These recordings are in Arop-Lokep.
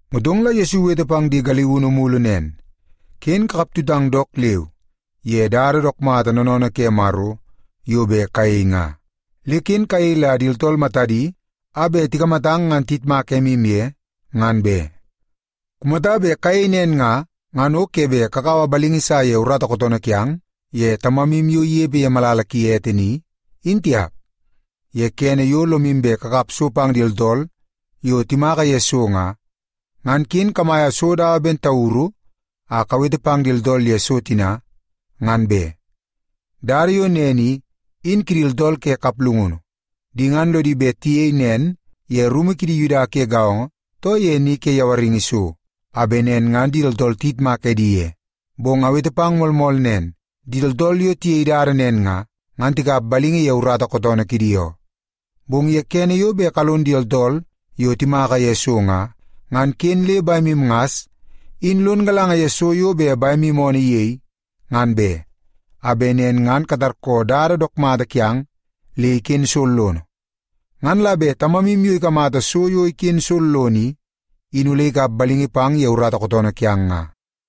Motong la Yesu iwete pang di galiunu mulu nen, “Ken kakap tutang dook leu ye dada dook mata noonoonoo ke Maro yo bet kayei nga. Le ken kayei la di tooltool matadi a bet tikamata ngan tiyitmak emu ye, ngan be. Kumata bet kayei nen nga, ngan o ke bet kakaua balingi sa ye urata kootoonoo kiang ye Tamamu yo inepe ye malala ki ete ni, in tiap. “Ye kene yo lomu bet kakap so pang di tooltool yo timaka ye so nga, ngan ken kamaia so dawa ben tauru a kawete pang di tooltool ye so tina, ngan be. Dada yo nen i, in kidi tooltool ke kaplungunu. Di ngan lodi bet tiyei nen ye rumu kidi Yuda ke gaongo, too ye ni ke yawaringi so, a bet nen ngan di tooltool tiyitmak edi ye. Bong awete pang moolmool nen, di tooltool yo tiyei dada nen nga, ngan tikap balingi ye urata kootoonoo kidi oo. Bong ye kene yo bet kalon di tooltool yo timaka ye so nga, ngan ken le bemu ngas in lon galanga ye so yo bet bemu oonoo iyei, ngan be, a bet nen ngan katarkoo dada dook mata kiang le iken sollono. Ngan la bet Tamamu yo ikamata so yo iken sollono i, in ole ikap balingi pang ye urata kootoonoo kiang nga.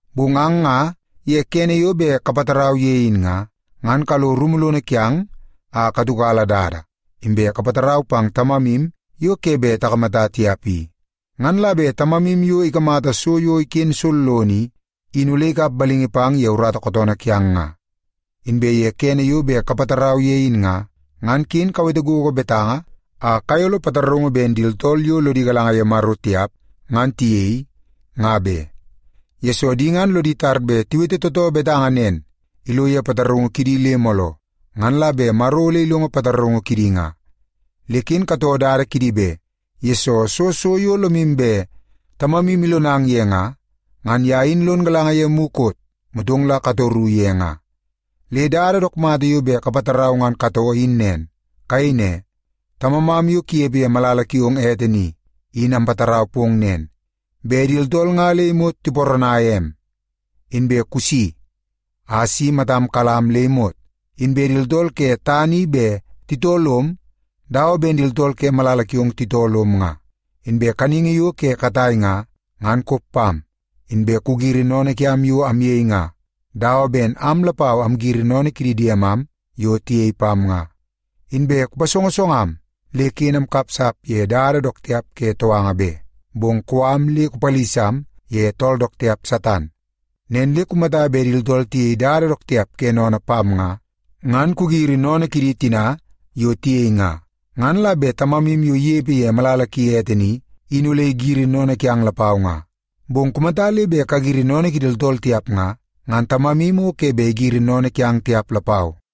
Bong ang nga ye kene yo bet kapatarau ye in nga, ngan kalo rumu lono kiang a katiukala dada, inbe kapatarau pang Tamamu yo ke bet takamata tiap i. Ngan la bet Tamamu yo ikamata so yo iken sollono i, in ole ikap balingi pang ye urata kootoonoo kiang nga. “Inbe ye kene yo bet kapatarau ye in nga, ngan ken kawete gogo betanga a kayolo pataraungu ben di tooltool yo lodi galanga ye Maro tiap ngan tiyei, nga be. Yesoo, di ngan lodi tar bet tiwete tootoo betanga nen ilo ye pataraungu kidi le mooloo, ngan la bet Maro ole ilongo pataraungu kidi nga. Le ken katoo dada kidi be, yesoo soo so yo lomu bet Tamamu ilonang ye nga, ngan ye in lon galanga ye mukot, motong la katoru ye nga. Le dada dook mata yo bet kapatarau ngan katoo in nen. Kayei ne, ‘Tamamam yo kunepe ye malala kiong ete ni, in ampatarau pong nen, bet di tooltool nga le imot tiparanaia em. Inbe kusi a si matam kalam am le imot, inbe di tooltool ke tana i bet titoo lom dawa ben di tooltool ke malala kiong titoo lom nga. Inbe kaningi yo ke katai nga, ngan kop pam. Inbe kugiri sennene kiam yo amyei nga, dawa ben am lapau amgiri sennene kidi diemam yo tiyei pam nga. Inbe kupasongosongam le ken amkapsap ye dada dook tiap ke touanga be, bong kou am le kupalisam ye tool dook tiap Satan.’ “Nen le kumata bet di tooltool tiyei dada dook tiap ke sennene pang nga, ngan kagiri sennene kidi tina yo tiyei nga. Ngan la bet Tamamu yo inepe ye malala ki ete ni, in ole igiri sennene kiang lapau nga. Bong kumata le bet kagiri sennene kidi tooltool tiap nga, ngan Tamamu o ke bet igiri sennene kiang tiap lapau.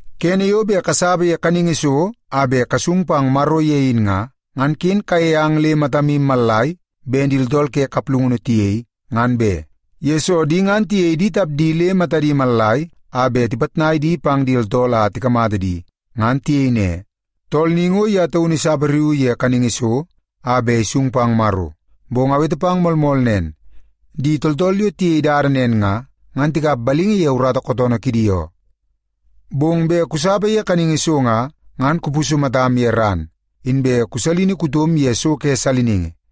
“Kene yo bet kasapa ye kaningi so a bet kasung pang Maro ye in nga, ngan ken kayei ang le matamu mallai ben di tooltool ke kaplungunu tiyei, ngan be. Yesoo, di ngan tiyei di tapdi le matadi mallai a bet tipitnai di pang di tooltool a tikamata di ngan tiyei ne, ‘Tool ni ngo ye taunu isapariuu ye kaningi so a bet isung pang Maro.’ Bong awete pang moolmool nen, di tooltool yo tiyei dada nen nga, ngan tikap balingi ye urata kootoonoo kidi oo. Bong bet kusapa ye kaningi so nga, ngan kupusu matam ye ran, inbe kusalini kutom ye so ke saliningi.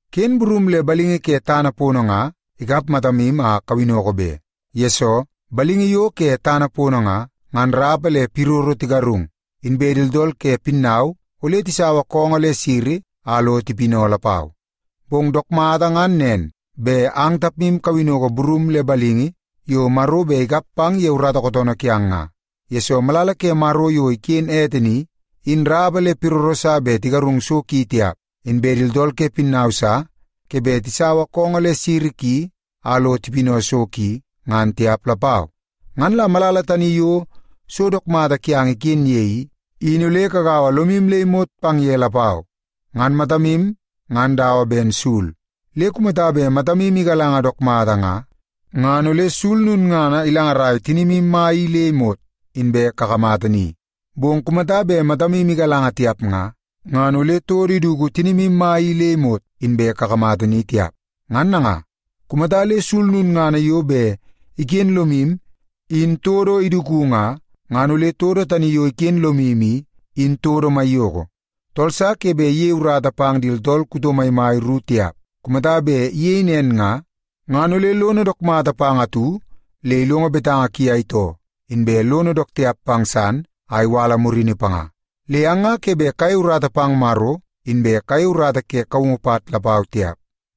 “Ken burum le balingi ke tana pono nga ikap matamu a kawinnoko be. Yesoo, balingi yo ke tana pono nga, ngan rapa le piroro tigarung, inbe di tooltool ke pinnau ole tisaua koongoo le siri a lo tipinau lapau. Bong dook mata ngan nen, bet ang tapmu kawinnoko burum le balingi yo Maro bet ikap pang ye urata kootoonoo kiang nga. Yesoo, malala ke Maro yo iken ete ni, in rapa le piroro sa bet tigarung so ki tiap, inbe di tooltool ke pinnau sa ke bet tisaua koongoo le siri ki a lo tipinau so ki, ngan tiap lapau. Ngan la malala tani yo so dook mata kiang iken ye i, in ole kagaua lomu le imot pang ye lapau. “Ngan matamu ngan dawa ben sul. Le kumata bet matamu igalanga dook mata nga, ngan ole sul lulngana ilangaraia tinimu mai i le imot inbe kakamata ni. Bong kumata bet matamu igalanga tiap nga, ngan ole todo iduku tinimu mai i le imot inbe kakamata ni tiap. Ngan nanga, kumata le sul lulngana yo bet iken lomu in todo iduku nga, ngan ole todo tani yo iken lomu i, in todo maiyoko. “Tool sa ke bet iyei urata pang di tooltool kuto maimai ru tiap. Kumata bet iyei nen nga, ngan ole lono dook mata pang atu le ilongo betanga ki a itoo, inbe lono dook tiap pang san a iwala murini panga. Le ang nga ke bet kayei urata pang Maro, inbe kayei urata ke kaungu pat lapau tiap.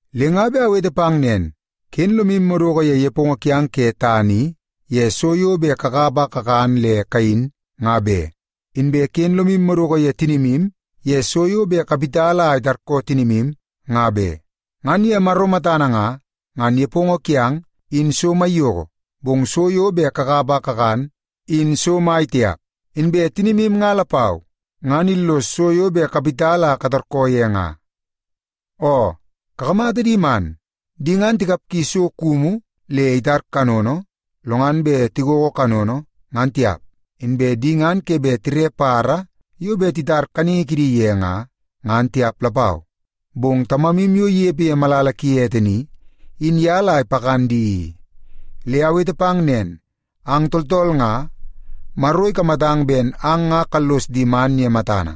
“Le nga bet awete pang nen, ken lomu madoko ye nepongo kiang ke tana i, ye so yo bet kakap a kakan le kayin, nga be. Inbe ken lomu madoko ye tinimu ye so yo bet kawit a itarkoo tinimu, nga be. Ngan ye Maro matana nga, ngan nepongo kiang, in so maiyoko, bong so yo bet kakap a kakan, in so mai tiap. Inbe tinimu nga lapau, ngan illoso so yo bet kawit a katarkoo ye nga. Oo, kakamata di man. Di ngan tikapgi so kumu le itar kanono, lo ngan bet tigogo kanono, ngan tiap. Inbe di ngan ke bet tire badabada yo bet titar kaningi kidi ye nga, ngan tiap lapau, bong Tamamu yo inepe ye malala ki ete ni, in ye la ipakan di i. Le awete pang nen, ang tooltool nga, Maro ikamatang ben ang nga kallos di man ye matana.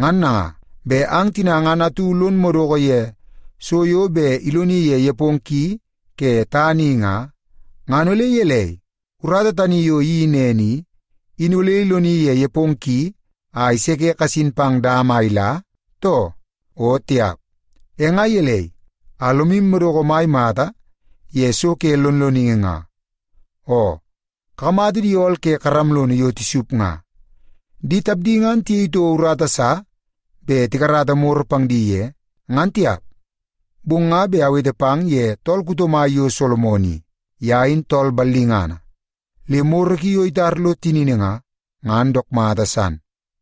Ngan nanga, bet ang tina ngan atu lon madoko ye so yo bet iloni ye nepongo ki ke tana i nga, ngan ole gelei, urata tani yo iyeii nen i, in ole iloni ye nepongo ki a iseke kasin pang dama a ila, too? O tiap! “E nga gelei a lomu madoko mai mata ye so ke lonloningi nga? Oo, kakamata di ool ke karam lono yo tisup nga. Di tapdi ngan tiyei toko urata sa bet tikarata moro pang di ye, ngan tiap. Bong nga bet awete pang ye tool kuto mai yo Solomon i. Ye in tool ballingana, le moro ki yo itar lo tinini nga, ngan dook mata san.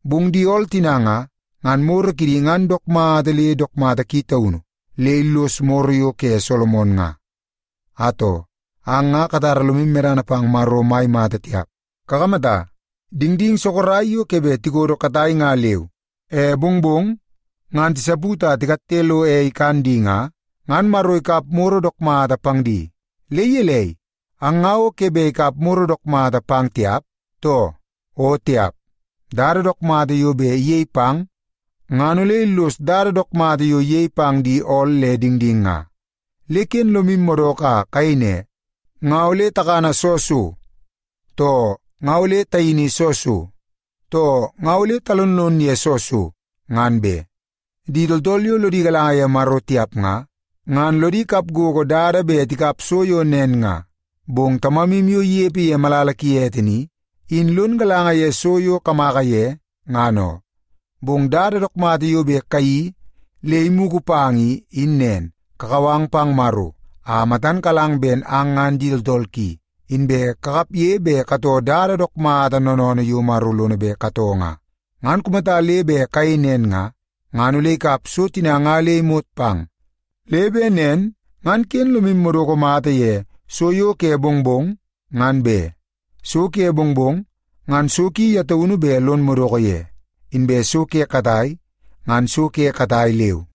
Bong di ool tina nga, ngan moro kidi ngan dook mata le dook mata ki taunu le illos moro yo ke Solomon nga. Atoo, ang nga katara lomu medana pang Maro mai mata tiap. Kakamata, dingding sorok yo ke bet tikodo katai nga leu, e mongmong ngan tisaput a tikatte lo ei ikan di nga, ngan Maro ikap moro dook mata pang di. Le gelei, ang nga o ke bet ikap moro dook mata pang tiap, too? O tiap! Dada dook mata yo bet iyei pang ngan ole illos dada dook mata yo iyei pang di ool le dingding nga. Le ken lomu madoko a kayei ne, ‘Nga ole takana soo so?’ too ‘Nga ole tayini soo so?’ too ‘Nga ole talonlon ye soo so?’ ngan be. Di tooltool yo lodi galanga ye Maro tiap nga, ngan lodi kap gogo dada bet tikap so yo nen nga. Bong Tamamu yo inepe ye malala ki ete ni, in lon galanga ye so yo kamaka ye, ngan oo. Bong dada dook mata yo bet kayeii le imugu pang i, in nen. Kakau ang pang Maro a matan kalang ben ang ngan di tooltool ki, inbe kakapge bet katoo dada dook mata noonoonoo yo Maro lono bet katoo nga. Ngan kumata le bet kayei nen nga, ngan ole ikap so tina nga le imot pang. Le bet nen ngan ken lomu madoko mata ye so yo ke mongmong, ngan be. So ke mongmong, ngan so ki ye taunu bet lon madoko ye. Inbe so ke katai, ngan so ke katai leu.”